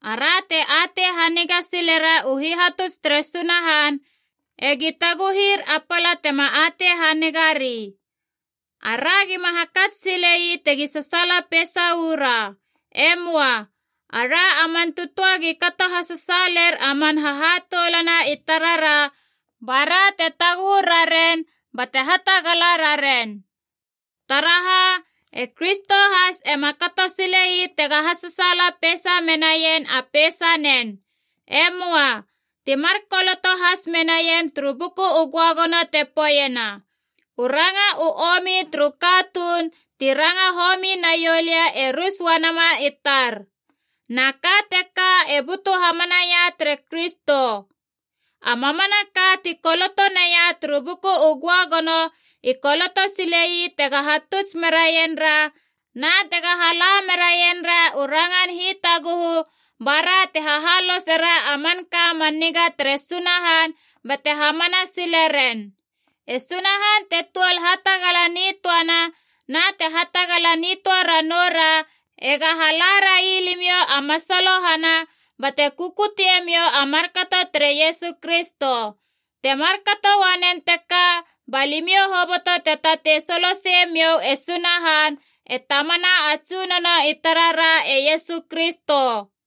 Ara te atei haniga silera u hihatuts tere Sunahan ega taguhir a pala tema atei hanigari. Ara gima hakats sile ii tegi sasaala peisa uu ra. E möa. Ara a man tötöa gi kato hasasaaler a man hahatoulana i tarara ba ra te taguhu raren bate hatagala raren. Taraha, e Kristo has ema kato sile ii tega hasasaala peisa menaien a peisanen. E möa. Ti mar koloto has menaien turu Buku u Göagono te poeiena, “U ranga u omi turu katuun ti ranga homi na ioulö e rus uanama i tar.” Na ka teka e butu hamanaia tere Kristo. A mamanaka ti koloto naia turu Buku u Göagono i koloto sile ii tega hatuts meraien ra na tega hala meraien ra u rangan hitaguhu ba ra te hahalosera a manka man niga tere Sunahan bate hamana sile ren. E Sunahan te tuol hatagala nitöana na te hatagala nitöa ranoura ega hala rai limiou a masalohana bate kukutemiou a markato tere Iesu Kristo. Te markato uanen teka ba limiou hoboto te tatei soloseie miou e Sunahan, e Tamana a Tsunono i tarara e Iesu Kristo.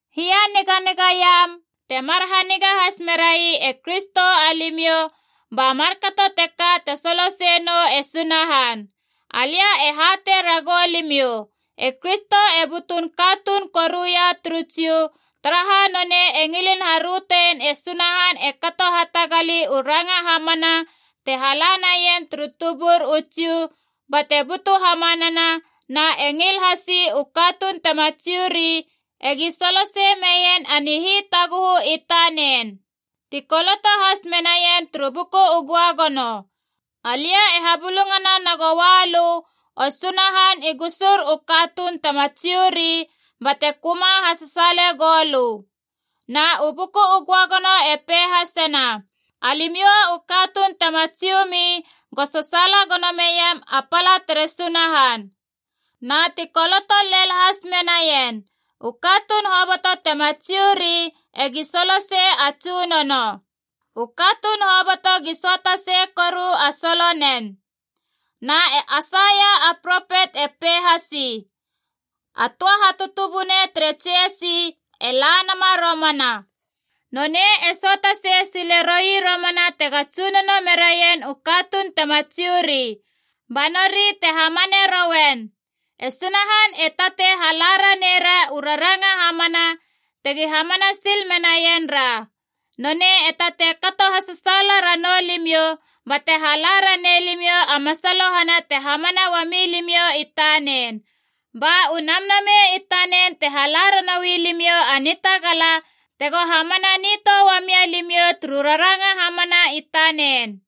Hianiganigaiam, temar haniga has merai e Kristo alimiou, ba markato teka te soloseie nou e Sunahan. Alia e hatei ragou limiou, e Kristo e butun katunun kuia turu Jiu, taraha nonei e ngilin harötein e Sunahan e kato hatagali u ranga hamana te hala naien turu tubur u Jiu bate butu hamanana, na e ngil hasi u katuun tema Jiu ri egi solosei meien a nihitaguhu i tanen. Ti koloto has menaien turu Buku u Göagono: “Alia e habulungana nagoua lö, o Sunahan, i gusur u katuun tema Jiu ri, bate köma hasasaale goulö.” Na u Buku u Göagono e pei hasena: “Alimiou u katuun tema Jiu mi go sasaala gono meiam a pala tere Sunahan!” Na ti koloto lel has menaien: “U katuun hoboto tema Jiu ri egi solosei a Tsunono. U katuun hoboto gi söata sei koru a solonen.” Na e Aisaia a propet e pei hasi: “A töa hatutubunei tere Jesi e la nama romana. Nonei e söata sei sile roi romana tega tsunono meraien u katuun tema Jiu ri. Ba nori te hamane rouen.” E Sunahan e tatei hala ranei ra u raranga hamana tegi hamana sil menaien ra. Nonei e tatei kato hasasaala ranou limiou bate hala ranei limiou a masalohana te hamana uami limiou i tanen. Ba u Namnamei i tanen te hala ranoui limiou a nitagala tego hamana nitöa uamia limiou turu raranga hamana i tanen.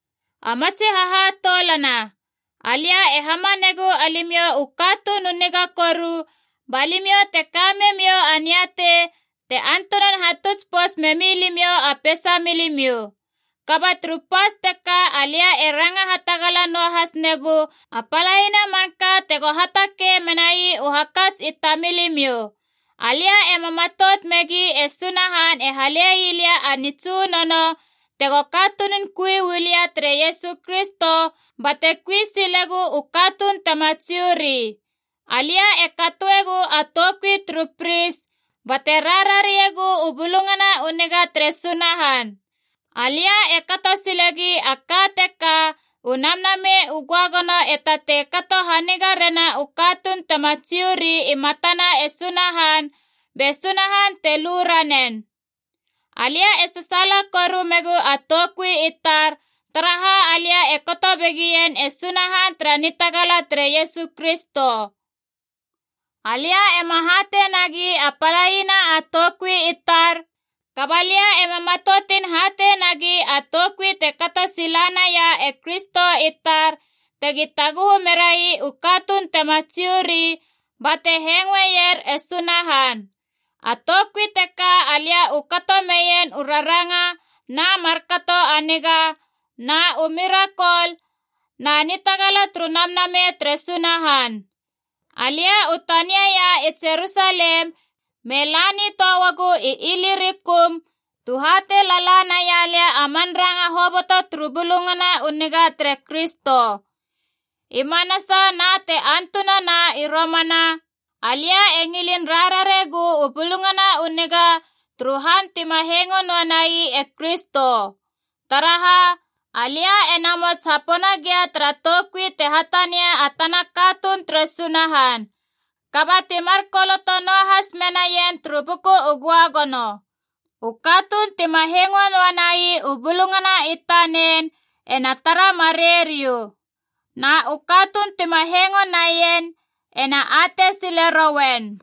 A matsi hahatoulana, alia e hamanegu alimiou u katuun u niga koru ba limiou te ka memiou a niatei te antunan hatuts pouts memi limiou a peisamiou. Kaba turu pas teka alia e ranga hatagala noa has negu a palaina manka tego hatakei menai u hakats i tamilimiou. Alia ema matout megi e Sunahan e hale ii lia a nitsunono tego katunun kui uu lia tere Iesu Kristo bate kui silegu u katuun tema Jiu ri. Alia e katoegu a toukui turu pris bate rarariegu u Bulungana u Niga tere Sunahan. Alia e kato silegi a ka teka u Namnamei u Göagono e tatei kato haniga rena u katuun tema Jiu ri i matana e Sunahan, be Sunahan te lu ranen. Alia e sasaala koru megu a toukui i tar, taraha alia e kato begien e Sunahan tara nitagala tere Iesu Kristo. Alia ema hatei nagi a palaina toukui i tar, kaba lia ema matoutin hatei nagi a toukui te kato sila naia e Kristo i tar, tegi taguhu merai u katuun tema Jiu ri bate hengoeier e Sunahan. A toukui teka alia u kato meien u raranga na markato a niga, na u mirakol, na nitagala turu Namnamei tere Sunahan. Alia u taniaia i Jerusalem me la nitöa uagu i Ilirikum tu hatei lala naia lia a man ranga hoboto turu Bulungana u Niga tere Kristo. I manasa na te antunana i romana, alia e ngilin rarariegu u Bulungana u Niga turu han tima hengo noa nai e Kristo. Taraha, alia e namots hapona gia tara toukui te hatania a tana katuun tere Sunahan. Kaba ti mar koloto noahas menaien turu Buku u Göagono: “U katuun tima hengo noa nai u bulungana i tanen ena tara marei riou. Na u katuun tima hengo naien ena atei sile rouen.”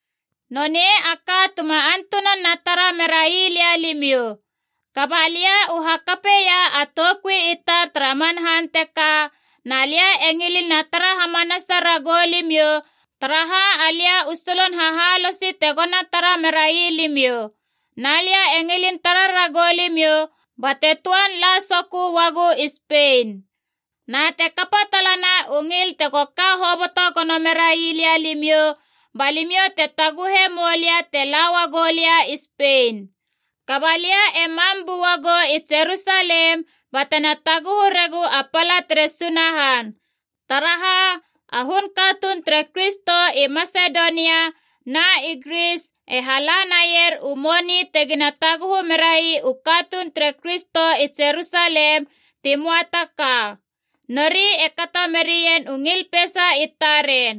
Nonei a ka tuma antunan na tara merai lia limiou. Kaba lia u hakapeia a toukui i tar tara man han teka, na lia e ngilin na tara hamanasa ragou limiou, taraha alia u solon hahaloso tego na tara merai limiou. Na lia e ngilin tara ragou limiou bate töan la sokö uagu i Spein. Na te kapa talana u ngil tego ka hoboto gono merai lia limiou, ba limiou te taguhe moulia te la uagu lia i Spein. Kaba lia e mam bua gou i Jerusalem batena taguhu regu a pala tere Sunahan. Taraha, a hun katuun tere Kristo i Masedonia na i Gris e hala naier u moni tegina taguhu merai u katuun tere Kristo i Jerusalem ti möa ta ka. Nori e kato merien u ngil peisa i taren.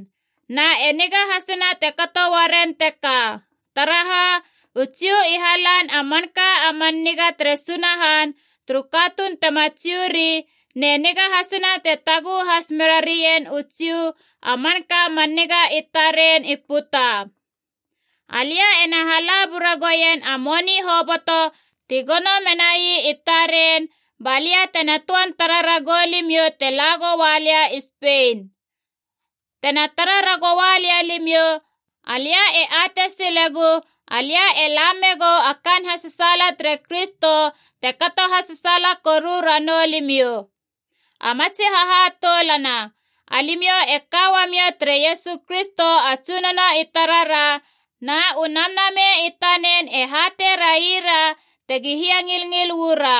Na e niga hasina te kato uaren teka. Taraha, u Jiu i halan a manka a man niga tere Sunahan turu katuun tema Jiu ri, ne niga hasina te taguhu has mera raien u Jiu a manka man niga i taren i puta. Alia ena hala bura goien a moni hoboto ti gono menai i taren, balia tena töan tara ragou limiou te la goua lia i Spein. Tena tara ragoua lia limiou, alia e atei silegu alia e la megou a kaan hasasaala tere Kristo te kato hasasaala koru ranou limiou. A matsi hahatoulana, alimiou e ka uamiou tere Iesu Kristo a Tsunono i tarara, na u Namnamei i tanen e hatei raira tegi hiangilngil uu ra.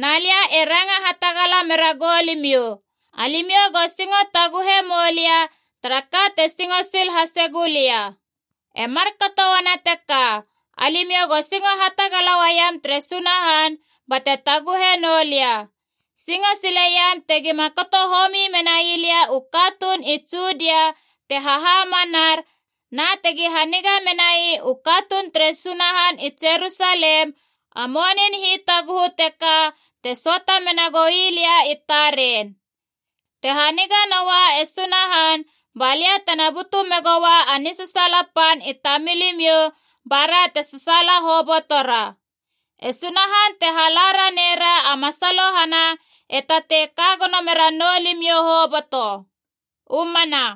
Na lia e ranga hatagala meragou limiou, alimiou go singo taguhe moulia tara ka te singo sil hase gulia. E markato uana teka, alimiou go singo hatagala uaiam tere Sunahan bate taguhe noulia. Singo sileiam tegima kato homi menai lia u katuun i Judia te hahamanar, na tegi haniga menai u katuun tere Sunahan i Jerusalem a monin hitaguhu teka te söata mena goi lia i taren. Te haniga noa e Sunahan, balia tena butu megoua a nisasaala pan i tamilimiou, ba ra te sasaala hobotora. E Sunahan te hala ranei ra a masalohana e tatei ka gono mera noulimiou hoboto. U mana.